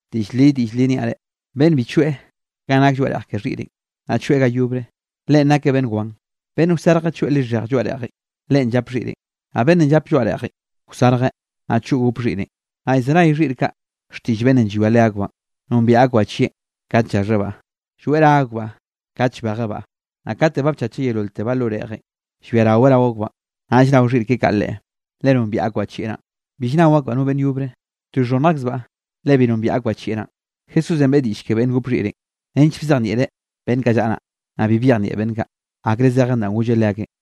Diꞌll li, diꞌll li niaꞌ reꞌ: Beꞌnne bi choeꞌ ganꞌ nake lloaꞌ reꞌj ke xhiꞌrenꞌ, naꞌ choeꞌ ga yobre, leꞌen nakeꞌ beꞌnn wan. Beꞌnn wsarjeꞌ choeꞌ lixhej lloaꞌ reꞌjenꞌ, leꞌen llap xhiꞌrenꞌ. Naꞌ beꞌnnenꞌ llape lloaꞌ reꞌjenꞌ wsarjeꞌ, naꞌ choꞌ gop xhiꞌrenꞌ. Naꞌ llzenay xhiꞌr kaꞌ xtiꞌll beꞌnnenꞌ llwia leakbaꞌn, nombiaꞌ akbaꞌ chieꞌn kat llaxhebaꞌ, lloeꞌ ra akbaꞌ kat llbejebaꞌ. Naꞌ kate ba bchacheꞌ yeololtebaꞌ lo reꞌjenꞌ, llbiaraweꞌ rao akbaꞌn, naꞌll nao xhiꞌr keꞌe kaꞌ leꞌe, le nombiaꞌ akbaꞌ chieꞌ naꞌn. Bill nnao akbaꞌ no beꞌnn yobre, to llxhonnj akzbaꞌ le bi nombiaꞌ akbaꞌ chieꞌ naꞌ. Jesúsenꞌ beꞌe diꞌll ke beꞌnn gop xhiꞌrenꞌ, nench bzejnieꞌreꞌ beꞌnn kaꞌ llaꞌa naꞌ, naꞌ bi byejnieꞌ beꞌnn kaꞌ, akre zejeꞌn danꞌ golleꞌ leakeꞌn.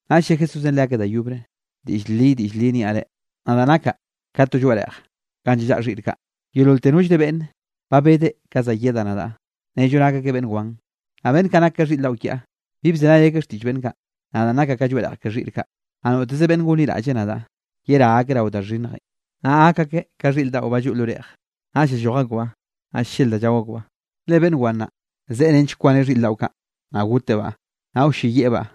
Naꞌ lle Jesúsenꞌ leakeꞌ da yobre: —Diꞌll li, diꞌll li niaꞌ reꞌ: Nadaꞌ nakaꞌ ka to lloaꞌ reꞌj ganꞌ llallaꞌa xhiꞌr kaꞌ. Yeololte nollre beꞌnn ba bedeꞌ ka za yedaꞌ nadaꞌ, nello nak akeꞌ beꞌnn wan. Naꞌ beꞌnn kaꞌ nak ka xhiꞌr daꞌo kiaꞌ, bi bzenay akeꞌ xtiꞌll beꞌnn kaꞌ. Nadaꞌn nakaꞌ ka lloaꞌ reꞌj ke xhiꞌr kaꞌ, naꞌ noteze beꞌnne gonliraꞌll nadaꞌ, yerá akeꞌ rao da xhinnjenꞌ, naꞌ gak akeꞌ ka xhiꞌr daꞌo ba lloꞌ lo reꞌj, naꞌll llalloj akbaꞌ, naꞌ llel da llao akbaꞌ. ’Le beꞌnn wan naꞌ, zeꞌe nench kwaneꞌ xhiꞌr daꞌo kaꞌ, naꞌ gotebaꞌ, naꞌ wlleyieꞌbaꞌ.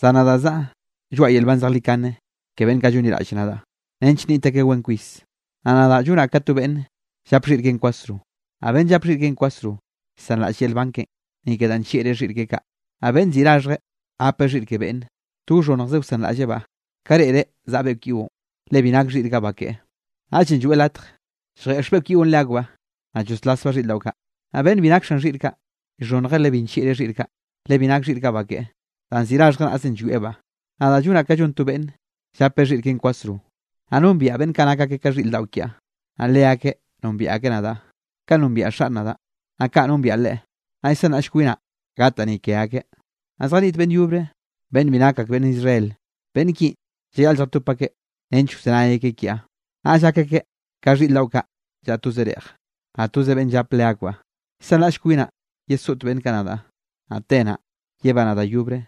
Zan nadaꞌ zaꞌa lloaꞌa yel nban zejlikane ke beꞌnn kaꞌ llonliraꞌlle nadaꞌ, nench nniꞌt akeꞌ wen kwis. Naꞌ nadaꞌ llonaꞌ ka to beꞌnne llap xhiꞌr keꞌen kwasro. Naꞌ beꞌnn llap xhiꞌr keꞌen kwasro llsanraꞌll yel nban keꞌen, ni ke danꞌ nllieꞌreꞌ xhiꞌr keꞌe kaꞌ. Naꞌ beꞌnn ziꞌi raxhjeꞌ gapeꞌ xhiꞌr ke beꞌnnenꞌ, to wxhonnjzeꞌ wsanraꞌllebaꞌ ka reꞌreꞌ zaꞌa beꞌkw yiꞌon, le bi nak xhiꞌr kaꞌ ba keꞌe. Naꞌllenꞌ lloeꞌ latj lljeꞌx beꞌkw yiꞌon leakbaꞌ, naꞌ lloslasbaꞌ xhiꞌr daꞌo kaꞌ. Naꞌ beꞌnn bi nak xan xhiꞌr kaꞌ, llxhonnjeꞌ le bi nllieꞌreꞌ xhiꞌr kaꞌ, le bi nak xhiꞌr kaꞌ ba keꞌe. Danꞌ ziꞌi raxhjeꞌ naꞌzenꞌ llwiebaꞌ. ’Nadaꞌ llonaꞌ ka llon to beꞌnn llape xhiꞌr keꞌen kwasro, naꞌ nombiaꞌ beꞌnn kaꞌ nak akeꞌ ka xhiꞌr daꞌo kiaꞌ, naꞌ leakeꞌ nombiaꞌ akeꞌ nadaꞌ. Kaꞌn nombiaꞌ Xaꞌn nadaꞌ, naꞌ kaꞌ nombiaꞌ Leꞌe, naꞌ llsanraꞌll kwinaꞌ gataꞌ ni ke akeꞌ. Naꞌ zjaniꞌt beꞌnn yobre beꞌnn bi nak ak beꞌnn Israel. Beꞌnn kinꞌ llayaꞌle lljatop akeꞌ nench wzenay akeꞌ kiaꞌ, naꞌll gak akeꞌ ka xhiꞌr daꞌo kaꞌ llaꞌa toze reꞌj, naꞌ toze beꞌnn llap leakbaꞌ. ’Llsanraꞌll kwinaꞌ yesoꞌt beꞌnn kaꞌ nadaꞌ, naꞌ te naꞌ, yebanaꞌ da yobre,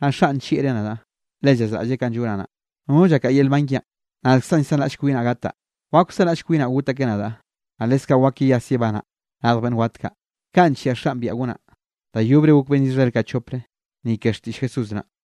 naꞌ Xaꞌn nllieꞌreꞌ nadaꞌ, le llazraꞌlleꞌ kanꞌ llonaꞌ naꞌ. Nono llakaꞌa yel nban kiaꞌn. Nadkzaꞌn llsanraꞌll kwinaꞌ gataꞌ. Wak wsanraꞌll kwinaꞌ got akeꞌ nadaꞌ, naꞌ leskaꞌ wak yeyas yebanaꞌ radj beꞌnn wat kaꞌ, kanꞌ nllia Xaꞌn biaꞌa gonaꞌ. Da yobre gok beꞌnn Israel kaꞌ chopre, ni ke xtiꞌll Jesús naꞌ.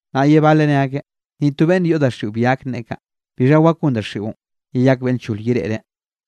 Naꞌ ye baleꞌ ne akeꞌ: —Ni to beꞌnn yoꞌ daxiꞌo bi gak nneꞌe kaꞌ. ¿Bixha wak gon daxiꞌon yeyak beꞌnn lchol yereꞌreꞌ?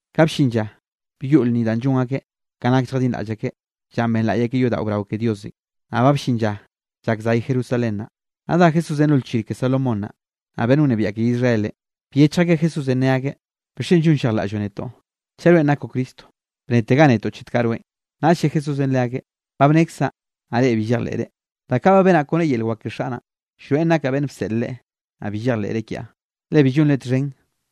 Ka bllin lla byoꞌ lnni danꞌ llon akeꞌ ka nak lljadinraꞌll akeꞌ llanꞌ benlaꞌy akeꞌ yodaꞌo brao ke Diosenꞌ, naꞌ ba bllin lla llak zay Jerusalén naꞌ. Naꞌ dá Jesúsenꞌ lo lchir ke Salomón naꞌ. Naꞌ beꞌnn wnebiaꞌ ke Israelenꞌ, byechj akeꞌ Jesúsenꞌ ne akeꞌ: —¿Bixchen llonllejlaꞌlloꞌ netoꞌ, chaꞌ rweꞌn nakoꞌ Cristo? Bnetega netoꞌ chet kaꞌ rweꞌn. Naꞌll lle Jesúsenꞌ leakeꞌ: —Ba bnekzaꞌ, naꞌ reꞌ bi llejleꞌre. Da kaꞌ ba benaꞌn kone yel wak ke Xaꞌ naꞌn, llroeꞌn nakaꞌ beꞌnn bseꞌl Leꞌe. Naꞌ bi llejleꞌre kiaꞌ, le bi llonre txhen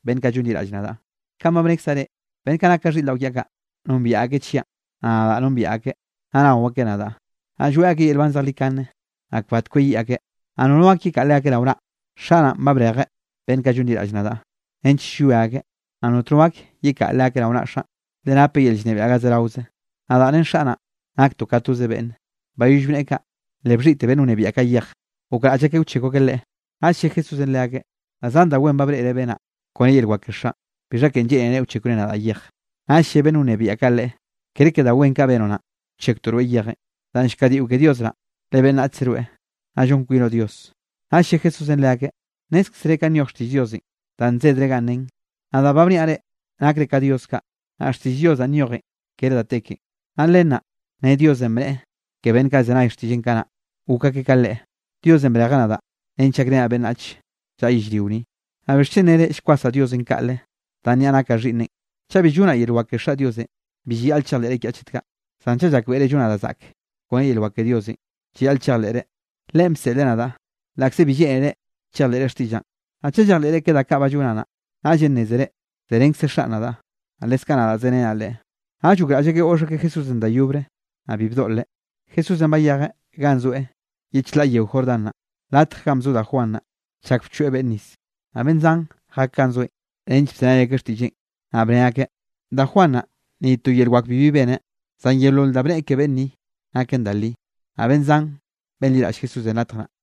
beꞌnn kaꞌ llonliraꞌll nadaꞌ, kanꞌ ba bnekzaꞌ reꞌ. Beꞌnn kaꞌ nak ka xhiꞌr daꞌo kiaꞌ kaꞌ, nombiaꞌ akeꞌ chiaꞌn. Naꞌ nadaꞌ nombiaꞌ akeꞌ, naꞌ nao akeꞌ nadaꞌ. Naꞌ lloeꞌ akeꞌ yel nban zejlikane, naꞌ kbat kweyiꞌ akeꞌ, naꞌ nono gak yekaꞌa leakeꞌ rao naꞌ. Xaꞌ naꞌ, ba brejeꞌ beꞌnn kaꞌ llonliraꞌll nadaꞌ, nench llwia akeꞌ, naꞌ notno gak yekaꞌa leakeꞌ rao naꞌa Xaꞌn, le napeꞌ yel llnebiaꞌ ga zeraoze. Nadaꞌ ren Xaꞌ naꞌ, naktoꞌ ka toze beꞌnne. Bayoll bneꞌe kaꞌ, le bxhiꞌte beꞌnn wnebiaꞌ kaꞌ yej, gokraꞌll akeꞌ wchekw akeꞌ Leꞌe. Naꞌll lle Jesúsenꞌ leakeꞌ: —Da zan da wen ba breꞌre benaꞌ kone yel wak ke Xaꞌn. ¿Bixha ken lleꞌnere wchekwre nadaꞌ yej? Naꞌll lle beꞌnn wnebiaꞌ kaꞌ Leꞌe: —Kere ke da wen kaꞌ benoꞌ naꞌn, wchekwtoꞌ rweꞌ yejenꞌ, danꞌ llkadiꞌo ke Dios naꞌ, le beꞌnnachze rweꞌ, naꞌ llon kwinoꞌ Dios. Naꞌll lle Jesúsenꞌ leakeꞌ: —Nnézkzere kanꞌ nyoj xtiꞌll Diosenꞌ danꞌ nzedrenꞌ ganꞌ nen: “Nadaꞌ ba bniaꞌ reꞌ, nakre ka dios kaꞌ.” Naꞌ xtiꞌll Dios danꞌ nyojen kere da te ken, naꞌ len naꞌ nen Diosenꞌ bneꞌe ke beꞌnn kaꞌ bzenay xtiꞌlleꞌn kanaꞌ, gok akeꞌ ka Leꞌe. Diosenꞌ brejeꞌ nadaꞌ nench gakrenaꞌ beꞌnnach llaꞌa yellrio ni, naꞌ ¿bixchen nere llkwasaꞌ Diosenꞌ kaꞌle, danꞌ niaꞌ nakaꞌ Xhiꞌnneꞌn? Chaꞌ bi llonaꞌ yel wak ke Xaꞌ Diosenꞌ, bi llayaꞌl chejleꞌre kiaꞌ chet kaꞌ. Zan chaꞌ llakbeꞌre llonaꞌ da zaꞌk kone yel wak ke Diosenꞌ, llayaꞌl chejleꞌre, Leꞌen bseꞌleꞌ nadaꞌ, laꞌkze bi lleꞌnere chejleꞌre xtiꞌllaꞌn. Naꞌ chaꞌ chejleꞌre ke da kaꞌ ba llonaꞌ naꞌ, naꞌllenꞌ nnézere zerenkze Xaꞌn nadaꞌ, naꞌ leskaꞌ nadaꞌ zerenaꞌ Leꞌe. Naꞌll gokraꞌll akeꞌ goꞌx akeꞌ Jesúsenꞌ da yobre, naꞌ bi bdoꞌleꞌ. Jesúsenꞌ bayejeꞌ ganꞌ zoeꞌ ye chlaꞌ yeo Jordán naꞌ, latje ganꞌ bzo da Juan naꞌ, chak bchoeꞌ beꞌnne nis. Naꞌ beꞌnn zan jak ganꞌ zoeꞌn nench bzenay akeꞌ xtiꞌlleꞌn, naꞌ bne akeꞌ: —Da Juan naꞌ, ni to yel wak bibi beneꞌ, zan yeolol danꞌ bneꞌe ke beꞌnn ni, naken da li. Naꞌ beꞌnn zan benliraꞌll Jesúsenꞌ latj naꞌ.